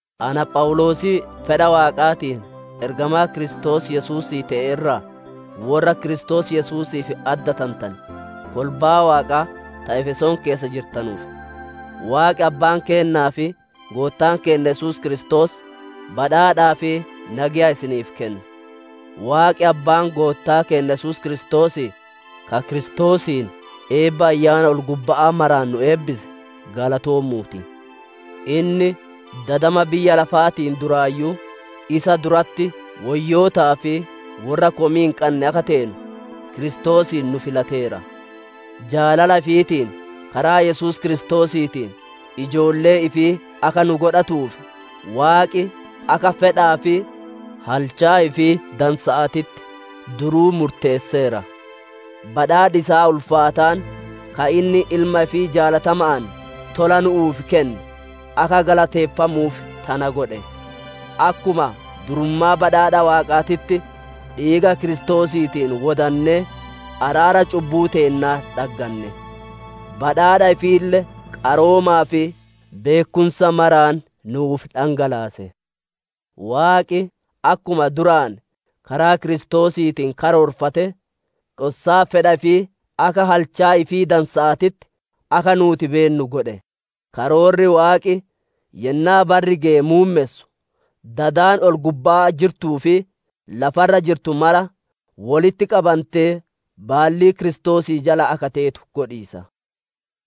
Ana Phawuloosii fedha Waaqaatiin ergamaa Kiristoos Yesuusii te'e irraa: Worra Kiristoos Yesuusiif addatantane, kolbaa Waaqaa ta Efesoon keessa jirtanuuf, Waaqi abbaan keennaa fi Goottaan keenna Yesuus Kiristoos badhaadhaa fi nageya isiniif kennu. Waaqi Abbaan Goottaa keenna Yesuus Kiristoosii, ka Kiristoosiin eebba Ayyaana ol-gubba'aa maraan nu eebbise, galatoomuu ti! Inni dadama biyya lafaatiin duraayyuu, isa duratti woyyootaa fi worra komii hin qanne akka teenu, Kiristoosiin nu filateera. Jaalala ifiitiin, karaa Yesuus Kiristoosiitiin ijoollee ifii akka nu godhatuuf Waaqi akka fedhaa fi halchaa ifii dansa'aatitti duruu murteesseera. Badhaadhi isaa ulfaataan, ka inni Ilma ifii jaalatama'aan tola nuuf kenne, akka galateeffamuuf tana godhe. Akkuma durummaa badhaadha Waaqaatitti, dhiiga Kiristoosiitiin wodannee, araara cubbuu teennaa dhaggane. Badhaadha ifiille qaroomaa fi beekkumsa maraan nuuf dhangalaase. Waaqi akkuma duraan karaa Kiristoosiitiin karoorfate, dhossaa fedha ifii akka halchaa ifii dansa'aatitti akka nuuti beennu godhe. Karoorri Waaqi yennaa barri geye muummessu, dadi ol-gubbaa jirtuu fi lafa irra jirtu mara, wolitti qabantee baallii Kiristoosii jala akka teetu godhiisa.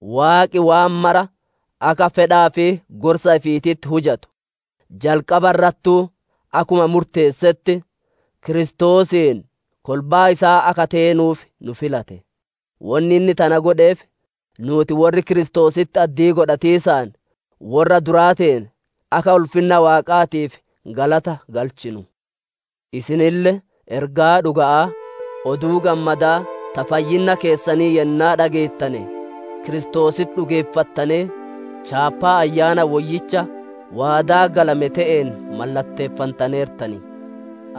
Waaqi waan mara akka fedhaa fi gorsa ifiititti hujatu, jalqaba irrattuu akkuma murteessetti, Kiristoosiin kolbaa isaa akka teenuuf nu filate. Wonni inni tana godheef, nuuti worri Kiristoositti addii godhatiisaan worra duraa teene, akka ulfinna Waaqaatiif galata galchinu. Isinille ergaa dhuga'aa, Oduu Gammadaa ta fayyinna keessanii yennaa dhageettane Kiristoositti dhugeeffattanee, Chaappaa Ayyaana Woyyicha waadaa galame te'een mallatteeffantaneertan.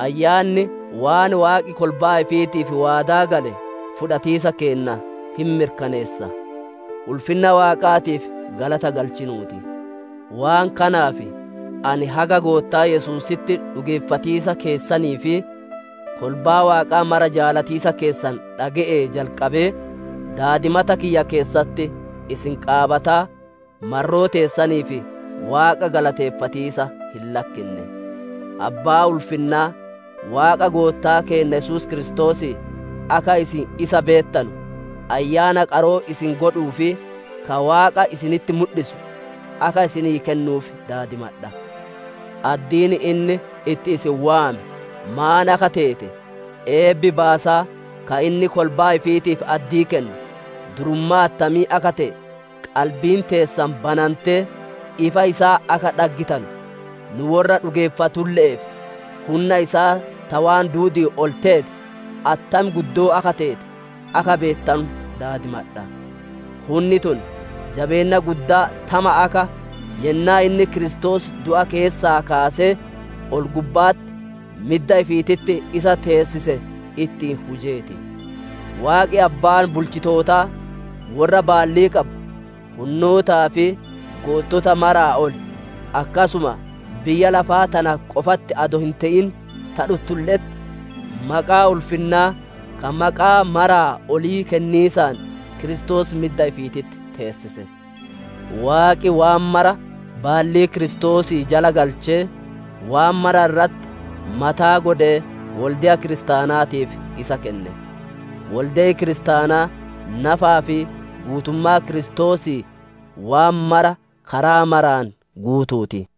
Ayyaanni waan Waaqi kolbaa ifiitiif waadaa gale fudhatiisa keenna hin mirkaneessa. Ulfinna Waaqaatiif galata galchinuu ti. Waan kanaaf, ani haga Goottaa Yesuusitti dhugeeffatiisa keessanii fi kolbaa Waaqaa mara jaalatiisa keessan dhage'ee jalqabee, daadimata kiyya keessatti isin qaabataa, marroo teessaniif Waaqa galateeffatiisa hin lakkinne. Abbaa ulfinnaa, Waaqa Goottaa keenna Yesuus Kiristoosii, akka isin isa beettanu, Ayyaana qaroo isin godhuu fi ka Waaqa isinitti mudhisu, akka isinii kennuuf daadimadha. Addiin inni itti isin waame maan akka teete, eebbi baasaa ka inni kolbaa ifiitiif addii kennu durummaa attamii akka te'e, qalbiin teessan banantee ifa isaa akka dhaggitanu, nu worra dhugeeffatulle'eef, hunna isaa ta waan duudi'iin ol teete, attam guddoo akka teete, akka beettanu daadimadha. Hunni tun jabeenna guddaa tama akka, yennaa inni Kiristoos du'a keessaa kaasee, ol-gubba'atti midda ifiititti isa teessise ittiin hujee ti. Waaqi Abbaan bulchitootaa, worra baallii qabu, hunnootaa fi goottota maraa ol, akkasuma biyya lafaa tana qofatti adoo hin te'in, ta dhuttulle'etti, maqaa ulfinnaa ka maqaa maraa olii kenniisaan Kiristoos midda ifiititti teessise. Waaqi waan mara baallii Kiristoosii jala galchee, waan mara irratti mataa godhee wolde'a kiristaanaatiif isa kenne. Wolde'i kiristaanaa nafaa fi guutummaa Kiristoosii waan mara karaa maraan guutuu ti.